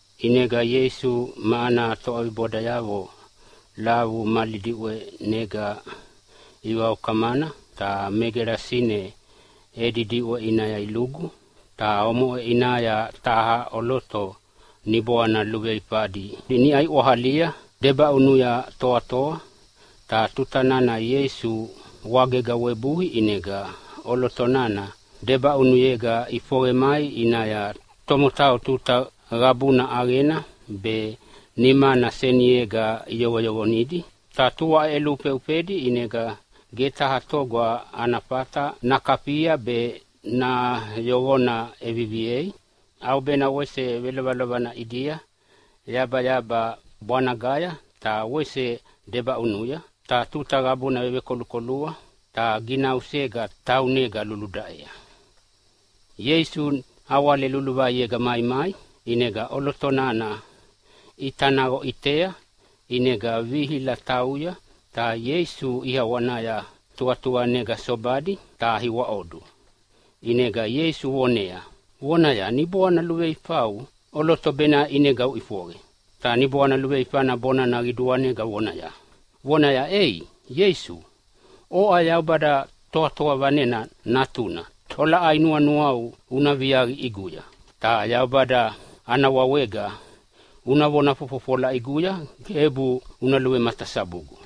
ʼInega Ieisu ma ana toʼabibodayavo lavu mali diʼwenega ivaukamana ta me Gelasine edi diʼwe ʼinaya ilugu. Ta omoʼe ʼinaya taha ʼoloto niboana luveifadi niʼa iʼwahalia debaʼunuya toatoa. Ta tuta nana Ieisu wagega webui, ʼinega ʼoloto nana debaʼunuyega ʼifoqe mai ʼinaya. Tomotau tuta qabuna ʼaqena be nimana seniega iyoqoyoqonidi, ta tua ʼeʼeluhufeufedi, ʼinega ge taha toga ana fata nakafia be nayoqona ʼeviviei. ʼAubena wese velovelovana ʼidia yabayaba bwanagaya ta wese debaʼunuya ta tuta qabuna vevekolukolua ta ginausega taunega luludaʼea. Ieisu nawale luluvaiega maimai ʼinega ʼoloto nana ʼita naqo ʼitea. ʼInega vihila tauya ta Ieisu ʼiawanaya tuqatuqanega sobadi ta iwaʼodu. ʼInega Ieisu vonea vonaya, “Niboana luveifau, ʼoloto baʼe ʼinega uʼifoqe!” Ta niboana luveifana bonana qiduanega vonaya, “Ei Ieisu, oʼa Yaubada Toatoa Vanena Natuna, tolaʼai nuanuau una viaqi ʼiguya? Ta Yaubada ana wawega una vona fofofola ʼiguya gebu una luvematasabugu.”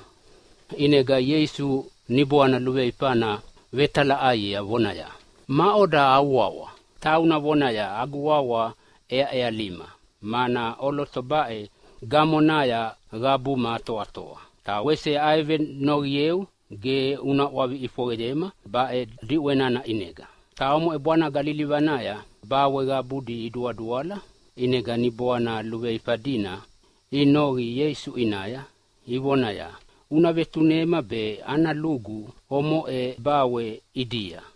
ʼInega Ieisu niboana luveifana vetalaʼaiea vonaya, “Maʼoda au wawa?” E tauna vonaya, “Agu wawa ʼEaʼealima, mana ʼoloto baʼe gamonaya qabuma atoatoa. Ta wese avevenoqieu ge una ʼwavi ʼifoqeyema baʼe diʼwe nana ʼinega.” Ta omoʼe bwanaga lilivanaya bawe qabudi iduaduala. ʼInega niboana luveifa dina inoqi Ieisu ʼinaya ivonaya, “Una vetunema be ana lugu omoʼe bawe ʼidia!”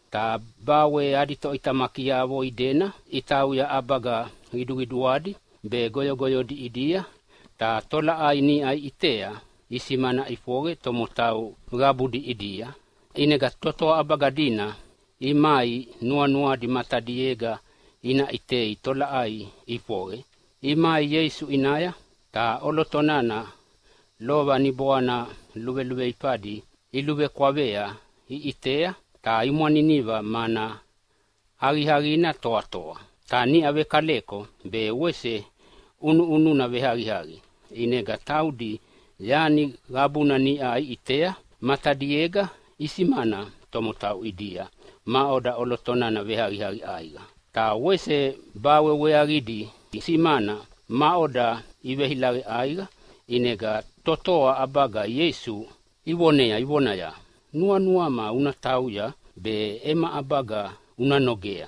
Ta bawe adi toʼitamakiavo idena itauya ʼabaga qiduqiduadi be goyogoyodi ʼidia, ta tolaʼai niʼa iʼitea isimana ʼifoqe tomotau qabudi ʼidia. ʼInega totoa ʼabaga dina imai nuanuadi matadiega ina ʼitea tolaʼai ʼifoqe. Imai Ieisu ʼinaya ta ʼoloto nana lova niboana luveluveifadi iluvekwavea iʼitea ta imwaniniva, mana aqiaqina toatoa ta niʼa vekaleko, be wese ʼunuʼununa veaqiaqi. ʼInega taudi yani qabuna niʼa iʼitea matadiega e isimana tomotau ʼidia maʼoda ʼoloto nana veaqiaqi ʼaiqa, ta wese bawe weaqidi isimana maʼoda iveilaqe ʼaiqa. ʼInega totoa ʼabaga Ieisu ivonea ivonaya, “Nuanuama una tauya ta ema ʼabaga una nogea!”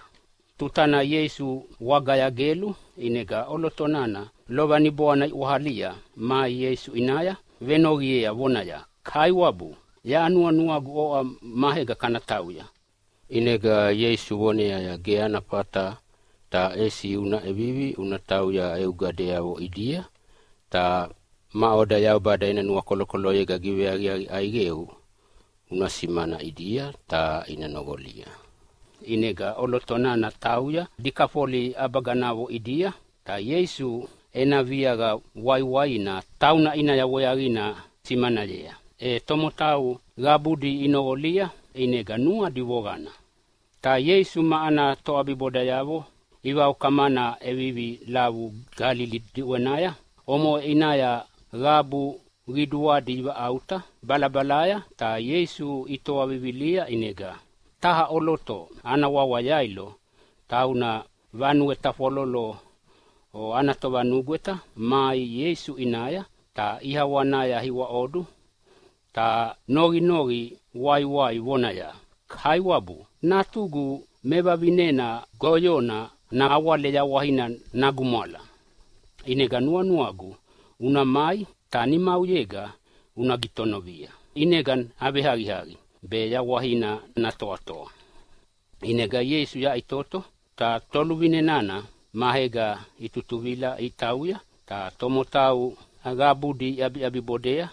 Tutana Ieisu wagaya gelu, ʼinega ʼoloto nana lova niboana iʼwahalia mai Ieisu ʼinaya venoqiea vonaya, “Kaiwabu, yaʼa nuanuagu oʼa maega kana tauya.” ʼInega Ieisu voneaya, “Ge ana fata, ta ʼesi una ʼevivi una tauya eu gadeavo ʼidia. Ta maʼoda Yaubada ena nuakolokoloyega giveaqiaqi ʼaiqeu una simanea ʼidia, ta ina noqolia.” ʼInega ʼoloto nana tauya Dikafoli ʼabaganavo ʼidia ta Ieisu ena viaqa waiwaina tauna ʼinaya weaqina simanayea, e tomotau qabudi inoqolia ʼinega nuadi voqana. Ta Ieisu ma ana toʼabibodayavo ivaukamana ʼevivi lavu Galili diʼwenaya. Omoʼe ʼinaya qabu qiduadi ivaʼauta balabalaya ta Ieisu itoa vivilia. ʼInega taha ʼoloto ana wawa Yailo, tauna vanue tafwalolo ana tovanugweta, mai Ieisu ʼinaya ta ʼiawanaya iwaʼodu, ta noqinoqi waiwai vonaya, “Kaiwabu, natugu mevavinena goyona nawale yawaina nagumwala, ʼinega nuanuagu una mai ta nimauyega una gitonovia ʼinega naveaqiaqi be mayawaina natoatoa.” ʼInega Ieisu yaʼitoto ta toluvine nana maega itutuvila itauya, ta tomotau qabudi iʼabiʼabibodea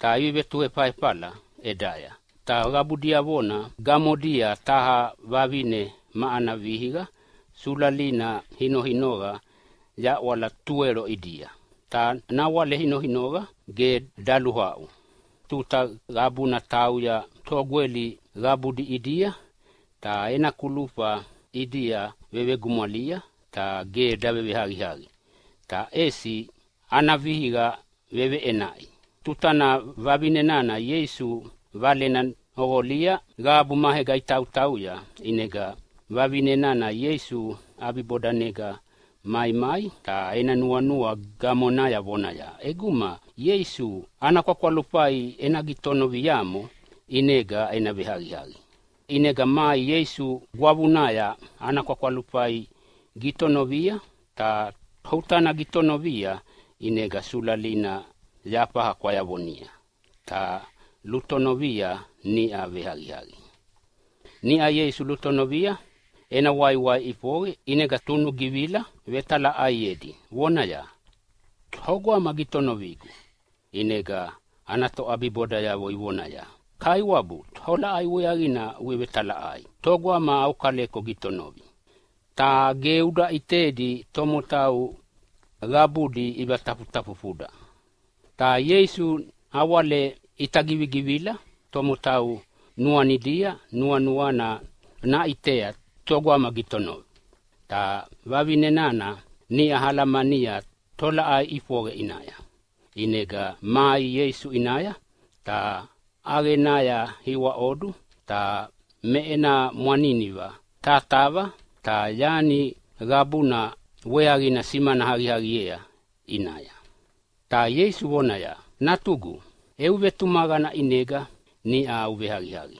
ta ivevetunuefala ʼedaya. Ta qabu diavona gamodia taha vavine ma ana vihiqa sulalina inoinoqa yaʼwala tuwelo ʼidia, ta nawale inoinoqa ge daluaʼu. Tuta qabuna tauya togweli qabudi ʼidia, ta ena kulufa ʼidia vegumwalia ta ge daveaqiaqi, ta ʼesi ana vihiqa veʼenaʼi. Tutana vavine nana Ieisu valena noqolia qabu maega itautauya, ʼinega vavine nana Ieisu ʼabibodanega maimai ta ena nuanua gamonaya vonaya, “ʼEguma Ieisu ana kwakwalufai ena gitonoviamo ʼinega ena veaqiaqi.” ʼInega mai Ieisu gwavunaya ta ana kwakwalufai gitonovia. Ta tuta nana gitonovia ʼinega sulalina yafaha kwayavonia ta lutonovia niʼa veaqiaqi. Niʼau Ieisu lutonovia ena waiwai ʼifoqe, ʼinega tunugivila vetalaʼaiedi vonaya, “Togama gitonovigu?” ʼInega ana toʼabibodayavo ivonaya, “Kaiwabu, tolaʼai weaqina uvetalaʼai togama au kaleko gitonovi, ta ge uda ʼitedi tomotau qabudi ivatafutafufuda.” Ta Ieisu nawale ʼita givigivila tomotau nuanidia nuanuana naʼitea togama gitonovi. Ta vavine nana niʼa alamania tolaʼai ʼifoqe ʼinaya, ʼinega mai Ieisu ʼinaya ta ʼaqenaya iwaʼodu. Ta me ena mwaniniva tatava, ta yani qabuna weaqina simana aqiaqiea ʼinaya. Ta Ieisu vonaya, “Natugu, eu vetumaqana ʼinega niʼa uveaqiaqi.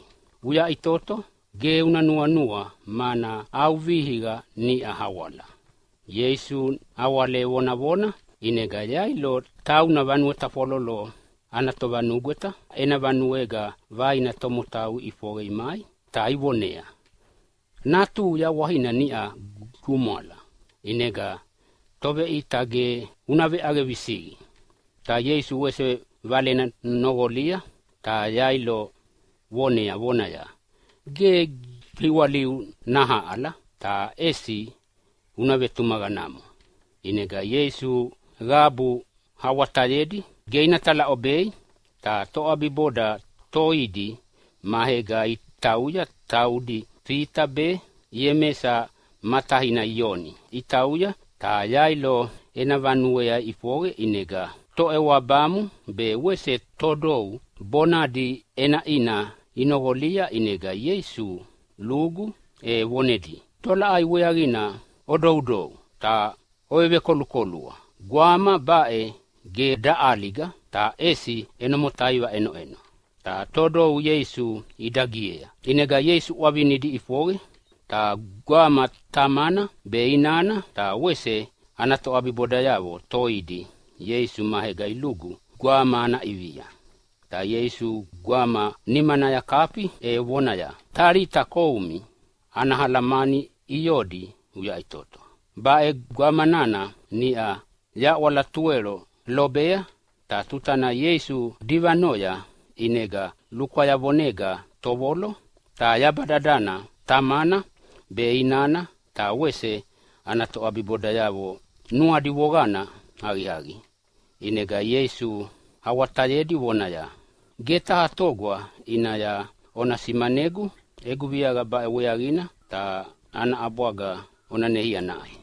Uyaʼitoto, ge una nuanua mana au vihiqa niʼa awala.” Ieisu nawale vonavona, ʼinega Yailo tauna vanue tafwalolo ana tovanugweta ena vanuega vaina tomotau iʼifoqe imai ta ivoneaya, “Natuhu yawaina niʼa gumwala, ʼinega Toveʼita ge una veʼaqe visiqi.” Ta Ieisu wese valena noqolia ta Yailo vonea vonaya, “Ge giwaliu nahaʼala, ta ʼesi una vetumaqanamo.” ʼInega Ieisu qabu awatayedi ge ina talaʼobei, ta toʼabiboda toidi maega itautauya, taudi Fita be Iemesa ma taina Ioni. Itautauya ta Yailo ena vanuea iʼifoqe ʼinega toʼewabamu be wese todou bonadi ʼenaʼina inoqolia. ʼInega Ieisu lugu e vonedia, “Tolaʼai weaqina odoudou ta ovevekolukolua? Gwama baʼe ge daʼaliga ta ʼesi ʼeno motaiva ʼenoʼeno.” Ta todou Ieisu idagiea. ʼInega Ieisu ʼwavinidi iʼifoqe, ta gwama tamana be inana ta wese ana toʼabibodayavo toidi Ieisu maega ilugu gwama ana ʼivia. Ta Ieisu gwama nimanaya kafi e vonaya, “Talita koum!” (Ana alamani “Iodi uyaʼitoto!”) Baʼe gwama nana niʼau yaʼwala tuwelo lobea. Ta tuta nana Ieisu divanoya ʼinega lukwayavonega tovolo ta yaba dadana. Tamana be inana ta wese ana toʼabibodayavo nuadi voqana aqiaqi. ʼInega Ieisu awatayedi vonaya, “Ge taha toga ʼinaya ona simanayegu egu viaqa baʼe weaqina, ta ana ʼabwaga ona neia naʼai.”